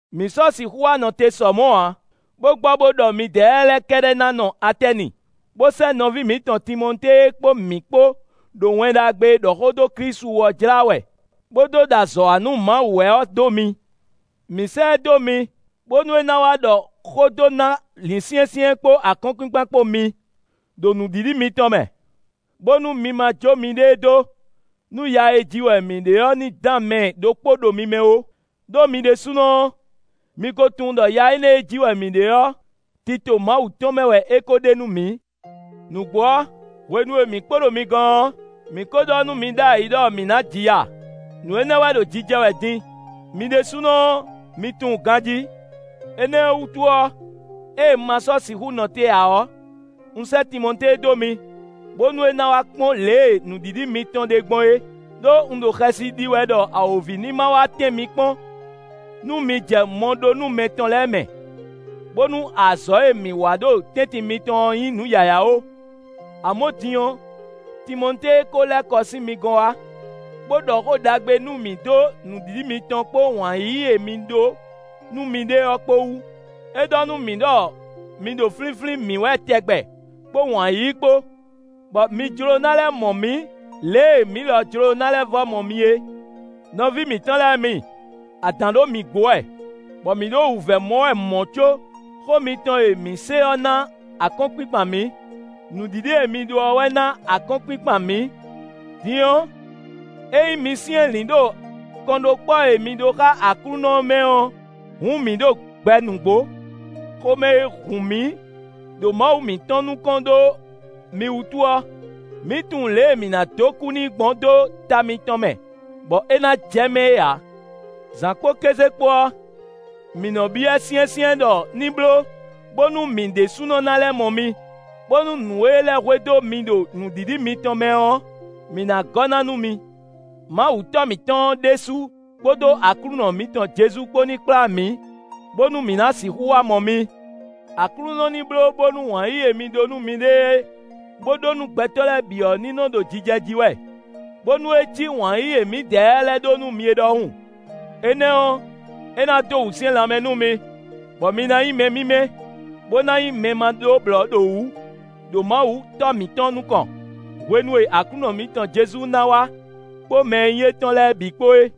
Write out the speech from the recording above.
Mǐ sɔ́ sixú wá nɔ te sɔ mɔ̌ ǎ, bó gbɔ bó ɖɔ mǐdɛɛ lɛ́ɛ kɛ́ɖɛ́ ná nɔ Atɛ́ni, bó sɛ́ nɔví mǐtɔn Timɔtée e kpó mǐ kpó ɖo Wɛn Ɖagbe e ɖɔ xó dó Klísu wú ɔ́ jlá wɛ, bó dó ɖo azɔ̌ wa nú Mawu wɛ ɔ́ dó mi. Mǐ sɛ́ ɛ dó mi, bónú é ná wá ɖɔ xó dó ná lǐnsyɛ́nsyɛ́n kpó akɔ́nkpinkpan kpó mi, ɖo nǔɖiɖi mitɔn mɛ; bónú mi ma jó miɖée dó nú ya e ji wɛ mǐ ɖe ɔ́ ní dán mɛ ɖokpó ɖo mi mɛ ó; ɖó mi ɖésúnɔ ɔ́, mi ko tunwun ɖɔ ya énɛ́ e ji wɛ mǐ ɖe ɔ́, tito Mawu tɔn mɛ wɛ é ko ɖe nú mǐ. Nǔgbó ɔ́, hwenu e mǐ kpo ɖo mi gɔ́n ɔ́, mǐ ko ɖɔ nú mi ɖ'ayǐ ɖɔ mǐ ná ji ya; nǔ énɛ́ wɛ ɖo jijɛ wɛ din; mi ɖésúnɔ ɔ́, mi tunwun ganjí. Énɛ́ ɔ́ wútu ɔ́, ée un ma sɔ́ sixú nɔ te ǎ ɔ́, un sɛ́ Timɔtée dó mi, bónú é ná wá kpɔ́n lě e nǔɖiɖi mitɔn ɖe gbɔn é, ɖó un ɖo xɛsi ɖi wɛ ɖɔ awǒvi ní ma wá tɛ́n mi kpɔ́n nú mi jɛ mɔɖónúmɛ tɔn lɛ́ɛ mɛ, bónú azɔ̌ e mǐ wa ɖo tɛ́ntin mitɔn ɔ́ nyí nǔ yǎyá ó. Amɔ̌ din ɔ́, Timɔtée ko lɛ́ kɔ sín mi gɔ́n wá, bó ɖɔ xó ɖagbe nú mǐ dó nǔɖiɖi mitɔn kpó wǎn yíyí e mi ɖó nú miɖée ɔ́ kpó wú. É ɖɔ nú mǐ ɖɔ mi ɖo flínflín mǐ wɛ tɛgbɛ kpó wǎn yíyí kpó, bɔ mi jló ná lɛ́ mɔ mǐ lě e mǐ lɔ jló ná lɛ́ vɔ́ mɔ mi é. Nɔví mǐtɔn lɛ́ɛ mi, adǎn ɖo mǐ gbo wɛ, bɔ mǐ ɖo wǔvɛ́ mɔ wɛ mɔ̌ có, xó mitɔn e mǐ se ɔ́ ná akɔ́nkpinkpan mǐ. Nǔɖiɖi e mi ɖó ɔ́ wɛ ná akɔ́nkpinkpan mǐ. Din ɔ́, ényí mi syɛ́nlǐn ɖo kɔnɖókpɔ́ e mi ɖó xá Aklúnɔ ɔ́ mɛ ɔ́, hǔn mǐ ɖo gbɛ nǔgbó. Xomɛ e hun mǐ ɖo Mawu mǐtɔn nukɔn ɖó mi wútu ɔ́, mǐ tunwun lě e mǐ ná dó kú n'i gbɔn dó ta mitɔn mɛ, bɔ é ná jɛ mɛ é ǎ. Zǎn kpó kéze kpó ɔ́, mǐ nɔ́ byɔ́ ɛ syɛ́nsyɛ́n ɖɔ ní bló bónú mǐ ɖésúnɔ ná lɛ́ mɔ mi, bónú nǔ e lɛ́ hwedó mi ɖo nǔɖiɖi mitɔn mɛ ɔ́, mǐ ná gɔ́ ná nú mi. Mawu Tɔ́ mǐtɔn ɔ́ ɖésú kpódó Aklúnɔ mǐtɔn Jezu kpó ní kplá mǐ, bónú mǐ ná sixú wá mɔ mi. Aklúnɔ ní bló bónú wǎn yíyí e mi ɖó nú miɖée, bó ɖó nú gbɛtɔ́ lɛ́ɛ bǐ ɔ́ ní nɔ ɖo jijɛ jí wɛ, bónú é ní cí wǎn yíyí e mǐdɛɛ lɛ́ɛ ɖó nú mi é ɖɔhun. Énɛ́ ɔ́, é ná dó wǔsyɛ́n lanmɛ nú mi, bɔ mi ná nyí mɛ mímɛ́, bó ná nyí mɛ ma ɖó blɔ̌ ɖo wǔ ɖo Mawu Tɔ́ mǐtɔn nukɔn, hwenu e Aklúnɔ mǐtɔn Jezu ná wá kpó mɛ e nyí étɔn lɛ́ɛ bǐ kpó é.